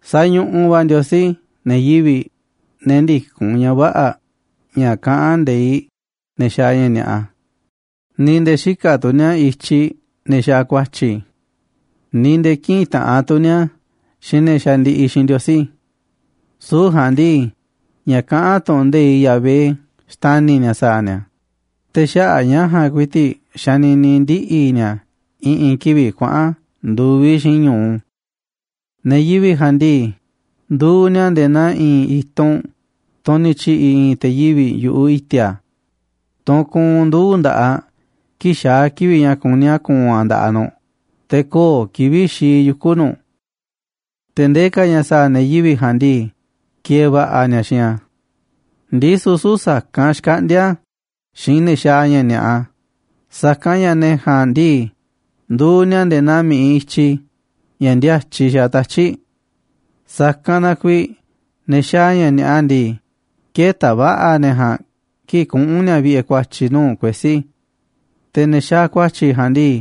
Sañuꞌuꞌ va̱ Ndiosí ne̱ yivi̱ꞌ, ne̱ ndïkún ña̱ vä̱ꞌa̱, ña̱ kaꞌán nde̱iꞌ ne̱ xaaꞌ ña̱ ni̱a̱ꞌa, ni̱ nde̱e̱ xïkaꞌ tu̱ ni̱a̱ i̱tyiꞌ ne̱ xaaꞌ ku̱a̱tyi̱, ni̱ nde̱e̱ kïꞌinꞌ taꞌanꞌ tu̱ ni̱a̱ xiinꞌ ne̱ xandiꞌiꞌ xiinꞌ Ndiosí. Süu̱ꞌ ja̱a̱nꞌ ndii, ña̱ kaꞌán tu̱ꞌu̱n nde̱iꞌ Yahvé xtani̱ ni̱a̱ sa̱a̱ ni̱a̱, te̱ xaꞌa̱ꞌ ña̱ ja̱a̱nꞌ ku̱i̱ti̱ꞌ xanini ndiꞌi̱ ni̱a̱ i̱ꞌi̱n kivi̱ꞌ kuaꞌa̱n ndu̱viꞌ xiinꞌ ñu̱u. Ne̱ yivi̱ꞌ ja̱a̱nꞌ ndii, nduuꞌ ni̱a̱ nde̱e̱ naa i̱i̱n i̱tunꞌ, tunꞌ ni̱ tyi̱ꞌi̱ i̱i̱n te̱ yivi̱ꞌ yu̱ꞌuꞌ i̱ti̱a̱, tunꞌ kuunꞌ nduu̱ꞌ nda̱ꞌaꞌ kii̱ꞌ xaá kivi̱ꞌ ña̱ kuní a̱ ku̱u̱n a̱ nda̱ꞌaꞌ nu̱ꞌ, te̱ köo̱ꞌ kivi̱ꞌ xii yuku̱ nu̱ꞌ. Te̱ ndee ka̱ ña̱ sa̱a̱ ne̱ yivi̱ꞌ ja̱a̱nꞌ ndii, ki̱e̱e̱ va̱ꞌa̱ ni̱a̱ xiinꞌ a̱. Ndisu̱ süu̱ꞌ sa̱kanꞌ xkaꞌndíá a̱ xiinꞌ ne̱ xaaꞌ ña̱ ni̱a̱ꞌa, sa̱kanꞌ ña̱ ne̱ ja̱a̱nꞌ ndii, nduuꞌ ni̱a̱ nde̱e̱ naa mi̱ꞌiꞌ i̱tyi, ña̱ ndíátyiꞌ xaaꞌ tatyi̱ꞌ. Sa̱kanꞌ na kuiiꞌ ne̱ xaaꞌ ña̱ ni̱a̱ꞌa ndii, kë̱ta̱ va̱ꞌa̱ ne̱ ja̱a̱nꞌ kii̱ꞌ kuꞌu̱n ni̱a̱ vi̱ꞌe̱ ku̱a̱tyi̱ nuu̱ꞌ kuesí. Te̱ ne̱ xaaꞌ ku̱a̱tyi̱ ja̱a̱nꞌ ndii,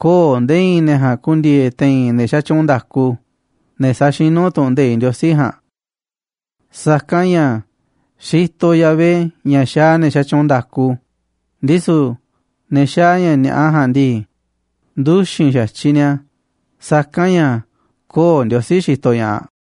köo̱ꞌ nde̱e̱ i̱i̱n ne̱ ja̱a̱nꞌ ku̱ndi̱e̱e̱ te̱i̱n ne̱ xatyuunꞌ nda̱ku, ne̱ saxinú tu̱ꞌu̱n nde̱iꞌ Ndiosí ja̱a̱nꞌ. Sa̱kanꞌ ña̱ xitoꞌ Yahvé ña̱ xaaꞌ ne̱ xatyuunꞌ nda̱ku, ndisu̱ ne̱ xaaꞌ ña̱ ni̱a̱ꞌa ja̱a̱nꞌ ndii, nduxi̱n xa̱tyiꞌ ni̱a̱, sa̱kanꞌ ña̱ köo̱ꞌ Ndiosí xitoꞌ ña̱ꞌaꞌ.